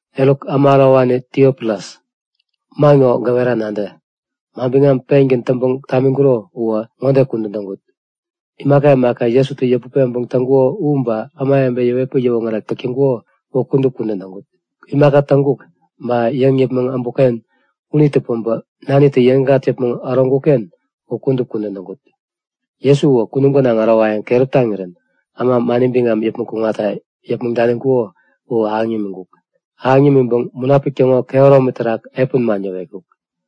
Eruk, äma ärowani Tiofilus, man ŋo gäwera nadä; Manbiŋam pengän täŋpäŋ tamiŋkuro uwä ŋode kudän täŋkut; Imaka imaka Jesutä yäput peŋpäŋ täŋkuko u ba ämawebe yäwetpäŋ yäwoŋärek täk täŋkuko u kudup kudän täŋkut. Imaka täŋkuk ba yäŋ yäpmäŋ äbukken unitä päbä Nanitä yäŋikŋat yäpmäŋ äroŋkuk-ken u kudup kudän täŋkut. Jesu uwä kunum gänaŋ ärowayäŋ keräp taŋirän äma mani biŋam yäpmäŋ kuŋatta yäpmäŋ daniŋkuko u ahäŋ yämiŋkuk. Ahäŋ yämiŋpäŋ Munapik täŋo kehäromi terak epän man yäwetkuk.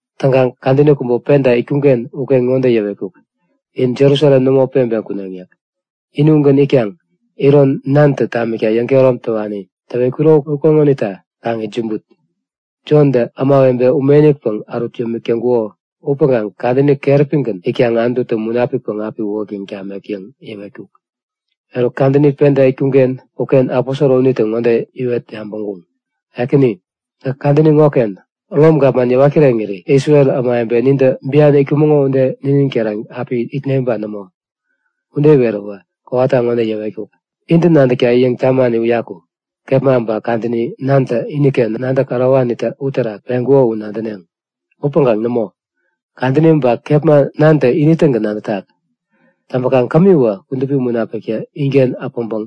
Täŋkaŋ kadäni kubä penta itkuŋ-ken uken ŋode yäwetkuk; In Jerusalem nämo peŋpeŋ kuneŋ yäk. Ini ugän itkaŋ, iron Nantä tamikta yäŋkehärom täwani täwetkuro ukeŋonita kaŋ itsämbut. Jontä ämawebe ume-inikpäŋ ärut yämik täŋkuko upäŋkaŋ kadäni keräpigän itkaŋ Anututä Munapikpäŋ api uwäktäŋ tamek yäŋ yäwetkuk. Eruk kadäni penta itkuŋ-ken uken aposoro unitä ŋode iwet yabäŋkuŋ; Ekäni, gäk kadäni ŋoken Rom gapman yäwat kireŋiri Isrel ämawebe nintä bian itkumäŋo ude ninin keran api itne ba nämo? Ude iweräwä kowata ŋode yäwetkuk; Intä nadäkta yäŋ tamani uyaku, kepma ba kadäni Nantä iniken nadäk ärowani uterak peŋkuko u nadäneŋ. Upäŋkaŋ nämo. Kadäni ba kepma Nantä ini-tägän nadätak. Täŋpäkaŋ kämiwä Kudupi Munapiktä inken äpäŋpäŋ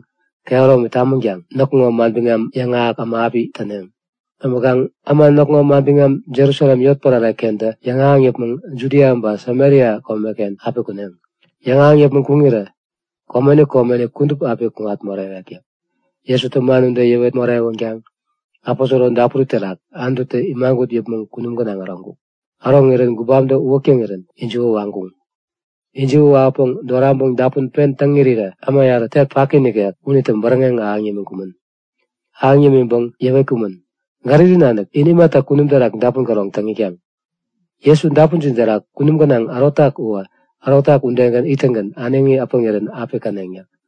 kehäromi tamänkaŋ näkŋo manbiŋam yäŋahäk äma api täneŋ. Täŋpäŋ inä näkŋo manbiŋam Jerusalem yotpärare-kentä yäŋahäŋ yäpmäŋ Judia ba Samaria komeken api kuneŋ. Yäŋahäŋ yäpmäŋ kuŋirä komeni komeni kudup api kuŋat morewek yäk. Jesutä man ude yäwet morewänkaŋ aposoro dapuri terak Anututä imagut yäpmäŋ kunum gänaŋ äroŋkuk. Äroŋirän gubamtä uwäk täŋirän ijiwä waŋkuŋ. Ijiwä wawäpäŋ doraŋpäŋ dapun pen täŋ irirä äma yarä tek paki nikek unitä bäräŋeŋ ahäŋ yämiŋkumän. Ahäŋ yämiŋpäŋ yäwetkumän; Galili nanik in imata kunum terak dapun käroŋ täŋ itkaŋ? Jesu dapunjin terak kunum gänaŋ ärotak uwä ärotak udegän ittäŋgän äneŋi äpäŋirän api käneŋ yäk.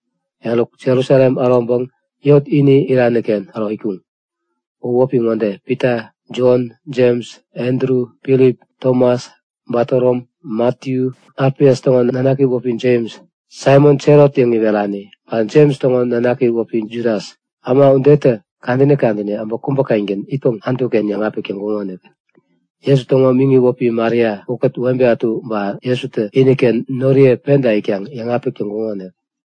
Eruk, Jerusalem äroŋpäŋ yot ini irani-ken äro itkuŋ. U wäpi ŋode; Pita, Jon, Jems, Andru, Filip, Tomas, Batorom, Matiyu, Alfias täŋo nanaki wäpi Jems, Saimon Selot yäŋ iwerani, ba Jems täŋo nanaki wäpi Judas. Äma udetä kadäni kadäni äbä kubä-kengän itpäŋ Anutu-ken yäŋapik täk täŋkuŋonik. Jesu täŋo miŋi wäpi Maria ukät webe ätu ba Jesutä iniken noriye penta itkaŋ yäŋapik täŋkuŋonik.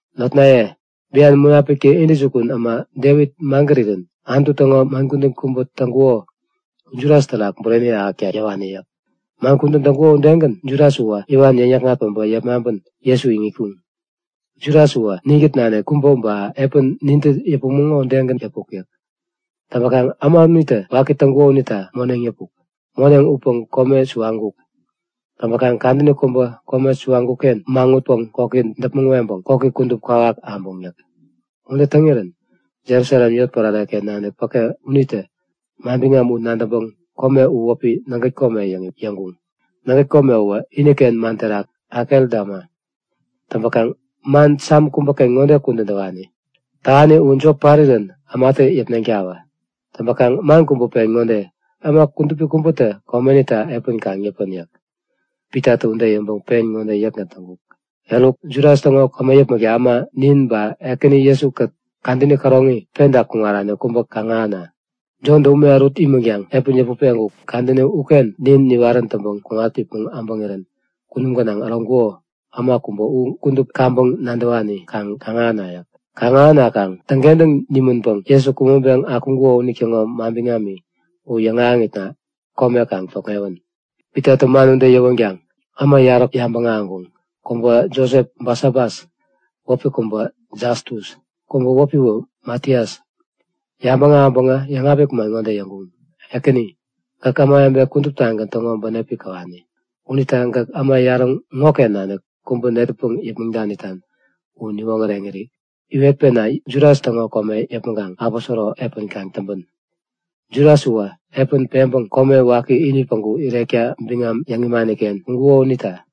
Notnaye, bian Munapiktä intäjukun äma Devit magärirän Anutu täŋo man kudän kubä täŋkuko u Judas terak bureni ahäkta yäwani yäk. Man kudän täŋkuko udegän Judas uwä iwan yäŋ-yäkŋat päbä yepmaŋpän Jesu iŋitkuŋ. Judas uwä ninkät nanik kubä ba epän nintä yäpumäŋo udegän yäpuk yäk. Täŋpäkaŋ äma unitä waki täŋkuko unita moneŋ yäpuk. Moneŋ upäŋ kome suwaŋkuk. Täŋpäkaŋ kadäni kubä kome suwaŋkuk-ken maŋutpäŋ koki däpmäŋ weŋpäŋ koki kudup kwawak abuŋ yäk. Ude täŋirän Jerusalem yotpärare-ken nanik päke unitä manbiŋam u nadäŋpäŋ kome u wäpi Nägät Kome yäŋ yäŋkuŋ. (Nägät Kome uwä iniken man terak Akeldama.) Täŋpäkaŋ man Sam kubäken ŋode kudän täwani; Tähani u jop parirän ämatä yäpneŋtawä. Täŋpäkaŋ man kubä pen ŋode; Äma kudupi kubätä komenita epän kaŋ yäpän yäk. Pitatä ude yäŋpäŋ pen ŋode yäkgän täŋkuk; Eruk, Judas täŋo kome yäpmäkta äma, nin ba Ekäni Jesu-kät kadäni käroŋi penta kuŋarani kubä kaŋ kaŋ-ahäna. Jontä ume ärut imänkaŋ epäni yäput peŋkuk kadäni uken nin niwarän täŋpäŋ kuŋat yäpmäŋ äbäŋirän kunum gänaŋ äroŋkuko äma kubä u kudup kaŋpäŋ nadäwani kaŋ kaŋ-ahäna yäk. Kaŋ-ahänakaŋ täŋkentäŋ nimänpäŋ Jesu kumäŋpeŋ akuŋkuko unitäŋo manbiŋami u yäŋahäŋitna kome kaŋ tokŋewän. Pitatä man ude yäwänkaŋ äma yarä yabäŋ ahäŋkuŋ. Kubä Josep-Basabas, wäpi kubä Jastus. Kubä wäpiwä Matias. Yabäŋ ahäŋpäŋä yäŋapik man ŋode yäŋkuŋ; Ekäni, gäk ämawebe kuduptagän täŋo bänep käwani. Unita gäk äma yarä ŋoken nanik kubä netäpäŋ yäpmäŋ danitan u niwoŋäreŋiri iwetpena Judas täŋo kome yäpmäŋkaŋ aposoro epän kaŋ täŋpän. Judas uwä epäni peŋpäŋ kome waki ini päŋku irekta biŋam yäŋ imani-ken kuŋkuko unita.